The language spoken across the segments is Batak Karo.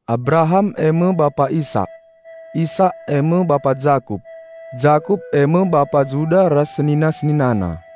Abraham eme bapa Isak; Isak eme bapa Jakup; Jakup eme bapa Juda ras senina-seninana;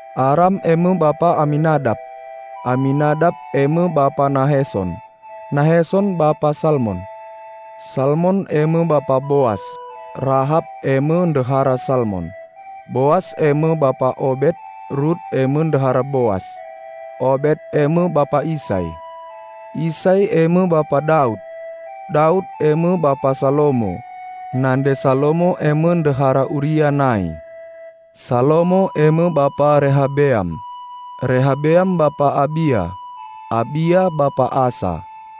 Aram eme bapa Aminadap; Aminadap eme bapa Nahesson; Nahesson bapa Salmon; Salmon eme bapa Boas (Rahap eme ndehara Salmon); Boas eme bapa Obet (Rut eme ndehara Boas); Obet eme bapa Isai; Isai eme bapa Daud. Daud eme bapa Salomo (nande Salomo eme ndehara Uria nai); Salomo eme bapa Rehabeam; Rehabeam bapa Abia; Abia bapa Asa;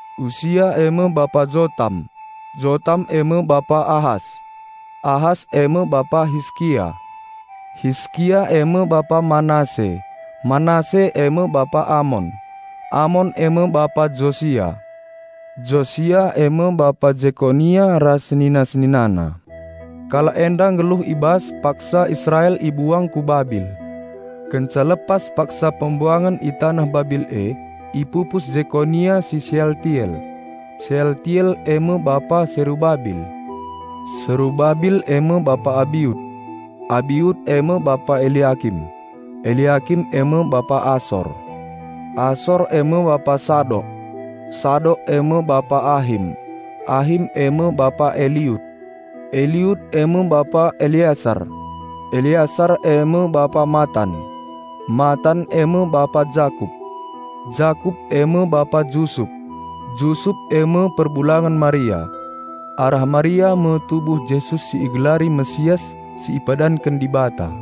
Usia eme bapa Jotam; Jotam eme bapa Ahas; Ahas eme bapa Hiskia; Hiskia eme bapa Manase; Manase eme bapa Amon; Amon eme bapa Josia; Josia eme bapa Jekonia ras senina-seninana. Kalak enda nggeluh i bas paksa Israel i buang ku Babil. Kenca lepas paksa pembuangen i taneh Babil e, ipupus Jekonia si Sealtiel; Sealtiel eme bapa Serubabil; Serubabil eme bapa Abiud; Abiud eme bapa Eliakim; Eliakim eme bapa Asor; Asor eme bapa Sadok; Sadok eme bapa Ahim; Ahim eme bapa Eliud; Eliud eme bapa Eleasar; Eleasar eme bapa Mattan; Mattan eme bapa Jakup; Jakup eme bapa Jusup; Jusup eme perbulangen Maria. Arah Maria me tubuh Jesus si igelari Raja Penampat si ipadanken Dibata.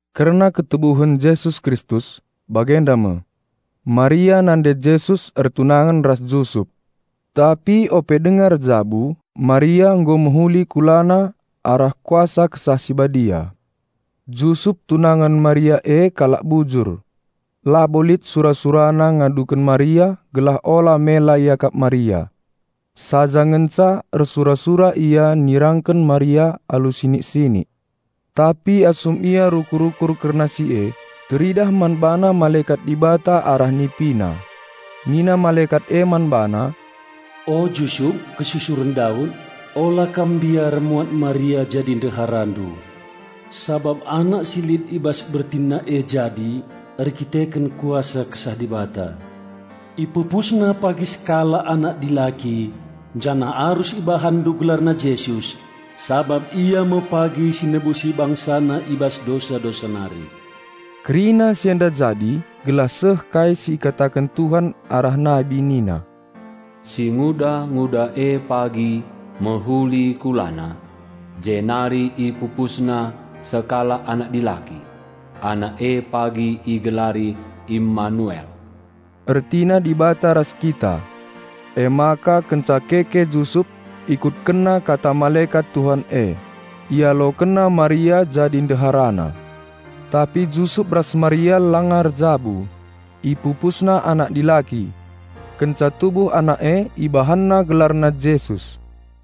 Kerna ketubuhen Jesus Kristus, bagenda me: Maria nande Jesus ertunangen ras Jusup. Tapi ope denga erjabu Maria nggo mehuli kulana arah Kuasa Kesah Si Badia. Jusup tunangen Maria e kalak bujur. Labo lit sura-surana ngaduken Maria gelah ola mela iakap Maria. Saja ngenca ersura-sura ia nirangken Maria alu sinik-sinik. Tapi asum ia rukur-rukur kerna si e, teridah man bana malekat Dibata arah nipina. Nina malekat e man bana, "O Jusup, kesusuren Daud, ola kam mbiar muat Maria jadi ndeharandu. Sabap anak si lit i bas bertinna e jadi erkiteken kuasa Kesah Dibata. Ipupusna pagi sekalak anak dilaki janah arus ibahanndu gelarna Jesus -- sabap Ia me pagi si nebusi BangsaNa i bas dosa-dosa nari." Kerina si enda jadi gelah seh kai si ikataken Tuhan arah nabi nina, 'Singuda-nguda e pagi mehuli kulana, jenari ipupusna sekalak anak dilaki. Anak e pagi igelari Immanuel' (ertina: "Dibata ras kita"). Emaka kenca keke Jusup, ikutkenna kata malekat Tuhan e. Ialokenna Maria jadi ndeharana. Tapi Jusup ras Maria langa erjabu, ipupusna anak dilaki. Kenca tubuh anak e ibahanna gelarna Jesus.